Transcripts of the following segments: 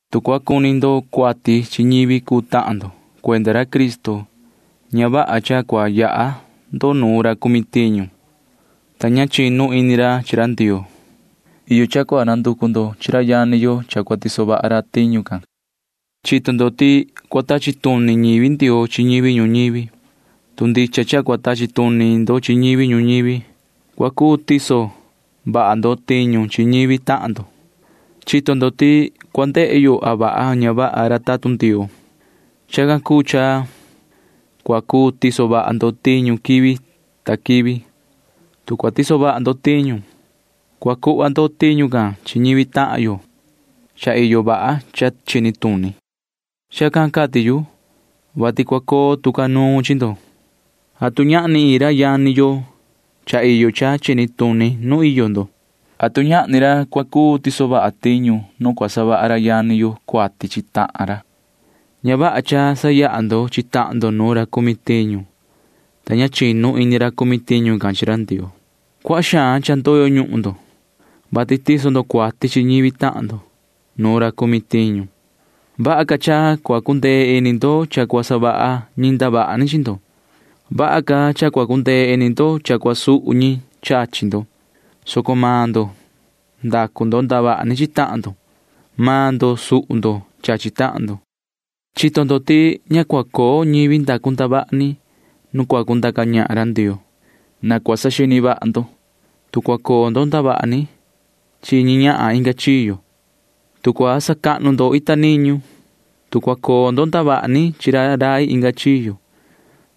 Tu cua cuni ndo cuati chi ñivi cuu tahan ndo cuenda ra Cristo, ña vaha cha cua yaha ndo nu ra cumi tiñu, ta ña chinu ini ra chi ra Ndioo. Iyo cha cua nanducu ndo chi ra yani yo cha cua tiso vaha ra tiñu can. Chito ndo ti cua tachi tuni ñivi Ndioo chi ñivi ñuñivi. Tu ndicha cha cua tachi tuni ndo chi ñivi ñuñivi, cua cuu tiso vaha ndo tiñu chi ñivi tahan ndo. Chito ndo ti cua ndehe yo a vaha a ña vaha ra tatun Ndioo. Chacan cuu cha cua cuu tiso vaha ndo tiñu quivi ta quivi. Tu cua tiso vaha ndo tiñu, cua cuhva ndo tiñu can chi ñivi tahan yo cha iyo vaha cha chini tuni. Chacan cati yu, vati cua coo tu ca nuun chi ndo. ¿Atu ñahni iin ra yani yo cha iyo cha chini tuni nuun iyo ndo? ¿Atu ñahni ra cua cuu tiso vaha tiñu nu cua savaha ra yani yo cuati chi tahan ra? Ña vaha cha sayaha ndo chi tahan ndo nu ra cumi tiñu, ta ña chinu ini ra cumi tiñu can chi ra Ndioo. Cuaha xaan cha ndoyo ñuhun ndo, vati tiso ndo cuati chi ñivi tahan ndo nu ra cumi tiñu. Vaha ca cha cua cundee ini ndo cha cua savaha ñi ndavaha ni chi ndo. Vaha ca cha cua cundee ini ndo cha cua suhu ñi chachi ndo, soco maan ndo ndacu ndavaha ni chi tahan ndo. Maan ndo suhu ndo chachi tahan ndo. Chito ndo ti ña cua coo ñivi ndacu ndavaha ni nu cua cundaca ñahan ra Ndioo. Na cua saxini vaha ndo. Tu cua coo ndo ndavaha ni chi ñi ñahan inga chiyo, tu cua sacahnu ndo ita niñu, tu cua coo ndo ndavaha ni chi ra rai inga chiyo,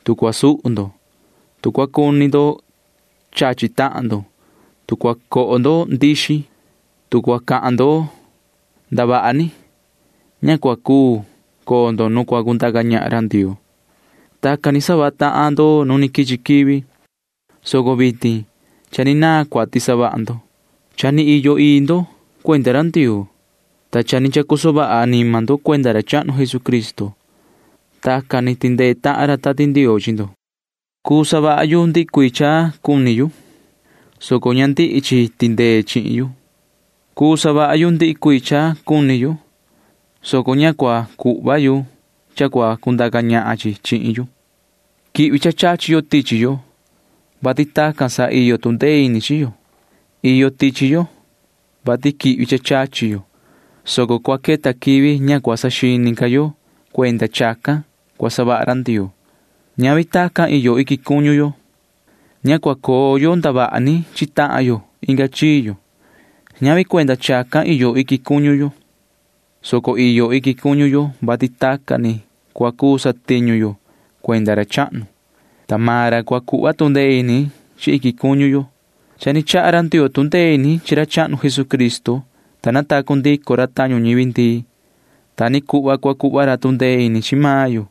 tu cua suhu ndo, tu cua cuni ndo chachi tahan ndo, tu cua coho ndo ndixi, tu cua cahan ndo ndavaha ni, ña cua cuu coo ndo nu cua cundaca ñahan ra Ndioo. Tacan ni savaha tahan ndo nu quichi quivi, soco vitin cha ni naan cuati savaha ndo. Cha ni iyo ii ndo cuenda ra Ndioo, ta cha ni chacoso vaha anima ndo cuenda ra chahnu Jesucristo. Tacan ni tindee tahan ra Tati Ndioo chi ndo. Cuu savaha yu ndihi cuii cha cuni yu, soco ña ndihi chi tindee chihin yu. Cuu savaha yu ndihi cuii cha cuni yu, soco ña cua cuhva yu cha cua cundaca ñahan chi chihin yu. Quihvi cha chachi yo tichi yo, vati tacan sa iyo tu ndee ini chi yo. Iyo tichi yo, vati quihvi cha chachi yo, soco cua queta quivi ña cua saxini ca yo cuenda chacan cua savaha ra Ndioo. Ñavi tacan iyo iquin cuñu yo. Ña cua coo yo ndavaha ni chi tahan yo inga chiyo. Ñavi cuenda chacan iyo iquin cuñu yo, soco iyo iquin cuñu yo, vati tacan ni cua cuu satiñu yo cuenda ra chahnu, ta maan ra cua cuhva tu ndee ini chi iquin cuñu yo. Cha ni chaha ra Ndioo tu ndee ini chi ra chahnu Jesucristo, ta natacu ndico ra tañu ñivi ndii. Ta ni cuhva cua cuhva ra tu ndee ini chi maan yo,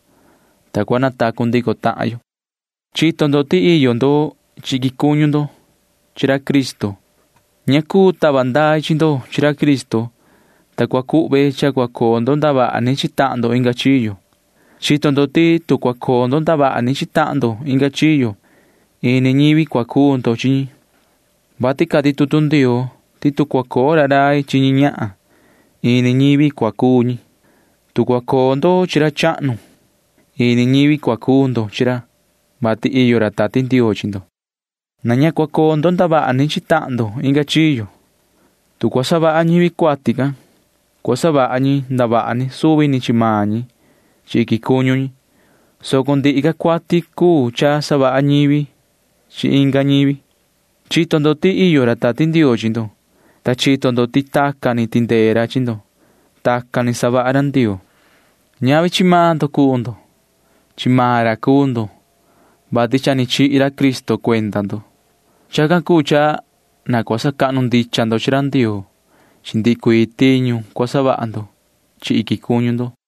ta cua natacu ndico tahan yo. Chito ndo ti iyo ndo chi iquin cuñu ndo chi ra Cristo. Ña cuu tava ndai chi ndo chi ra Cristo, ta cua cuhve cha cua coo ndo ndavaha ni chi tahan ndo inga chiyo. Chito ndo ti tu cua coo ndo ndavaha ni chi tahan ndo inga chiyo, ini ñivi cua cuu ndo chi ñi, vati cati tutu Ndioo ti tu cua coo ra rai chi ña ñahan, ini ñivi cua cuu ñi. Tu cua coo ndo chi ra chahnu, ini ñivi cua cuu ndo chi ra, vati iyo ra Tati Ndioo chi ndo. Na ña cua coo ndo ndavaha ni chi tahan ndo inga chiyo. Tu cua savaha ñivi cuati can, cua savaha ñi ndavaha ni suvi ni chi maan ñi chi iquin cuñu ñi, soco ndihi ca cuati cuu cha savaha ñivi chi inga ñivi. Chito ndo ti iyo ra Tati Ndioo chi ndo, ta chito ndo ti tacan ni tindee ra chi ndo. Tacan ni savaha ra Ndioo. Ñavi chi maan ndo cuu ndo. Chi maan ra cuu ndo, vati cha ni chihi ra Cristo cuenda ndo. Chacan cuu cha na cua sacahnu ndicha ndo chi ra Ndioo chi ndihi cuii tiñu cua savaha ndo chi iquin cuñu ndo.